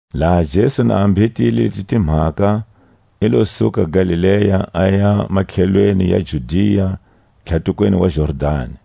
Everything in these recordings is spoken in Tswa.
Laha Jesu na mbhetile leti timhaka, i lo suka Galilea, aya matlhelweni ya Judia tlhatukweni wa Jordani.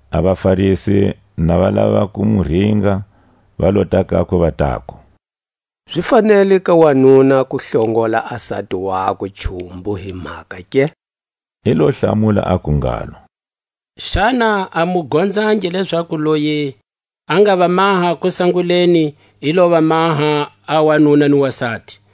A vaFarisi na va lava ku mu ringa, va lota kakwe, va taku; Zi fanele ka wanuna ku hlongola a sati wakwe hi cumbu hi mhaka ke? I lo hlamula aku ngalo: Xana a mu gonzangi, lezaku loyi a nga va maha kusanguleni i lo va maha a wanuna ni wasati?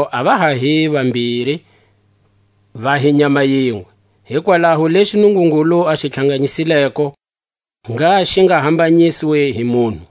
Lezo a va ha hi vambiri, va hi nyama yinwe. Hikwalaho lexi Nungungulu a xi tlhanganyisileko, ngha xi nga hambanyiswi hi munhu.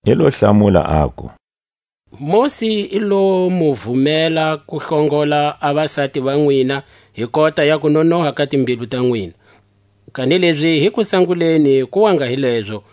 I lo hlamula, aku: Mosi i lo mu vumela ku hlongola a vasati va nwina hi kota ya kunonoha ka timbilu ta nwina; kanilezi hi kusanguleni ku wa nga hi lezo.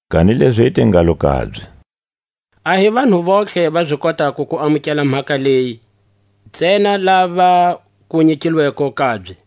Kanilezi i te ngalo kabye; A hi vanhu vontlhe va zi kotako ku amukela mhaka leyi, ntsena lava ku nyikilweko kabye.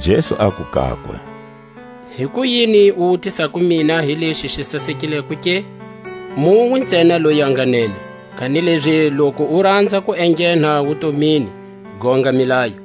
Jesu aku kakwe: Hikuyini u wutisako mina hi lexi xi sasekileko ke? Munwe ntsena loyi a nga nene. Kanilezi loku u ranza ku enghena wutomini, gonga milayo.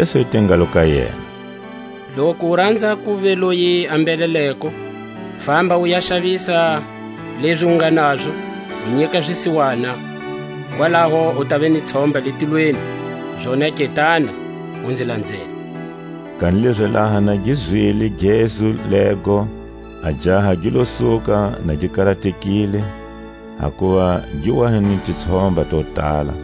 Jesu i te ngalo ka yena: Loku ti ranza kuva loyi a mbheleleko, famba u ya xavisa lezi u nge nazo, u nyika zisiwana; kwalaho u tava ni tshomba le tilweni; zonake tana, u nzi lanzela. Kanilezi laha na gi zwile gezu lego, a jaha gi lo suka na gi karatekile, hakuva gi wa hi ni titshomba to tala.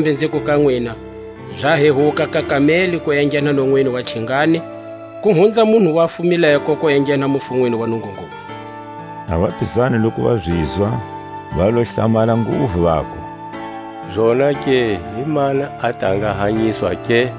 Kambe nziku ka nwina: Za hehuka ka kameli ku enghena nonwini wa chingani, ku hunza munhu a fumileko ku enghena mufunweni wa Nungungulu. A vapizani loku va zizwa, va lo hlamala nguvu, vaku: Zonake himani a ta nga hanyiswa ke?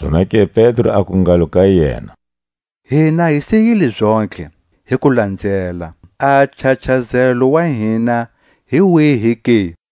Zonake Pedro aku ngalo ka yena: Hina hi siyile zontlhe, hi ku lanzela; a nchachazelo wa hina hi wihi ke?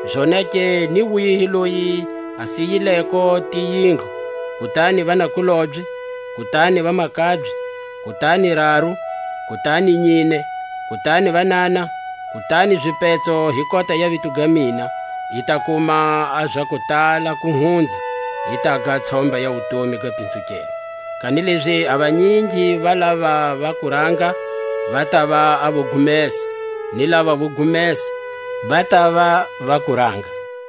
Zonake ni wihi loyi a siyileko tiyindlu, kutani vanakulobye, kutani vamakabye, kutani raru, kutani nyine, kutani vanana, kutani zipetso hi kota ya vito ga mina, i ta kuma a za kutala ku hunza, i taga a tshomba ya wutomi ga pinzukelwa. Kanilezi a vanyingi va lava va kuranga, va tava a vo gumesa, ni lava vo gumesa va tava va kuranga.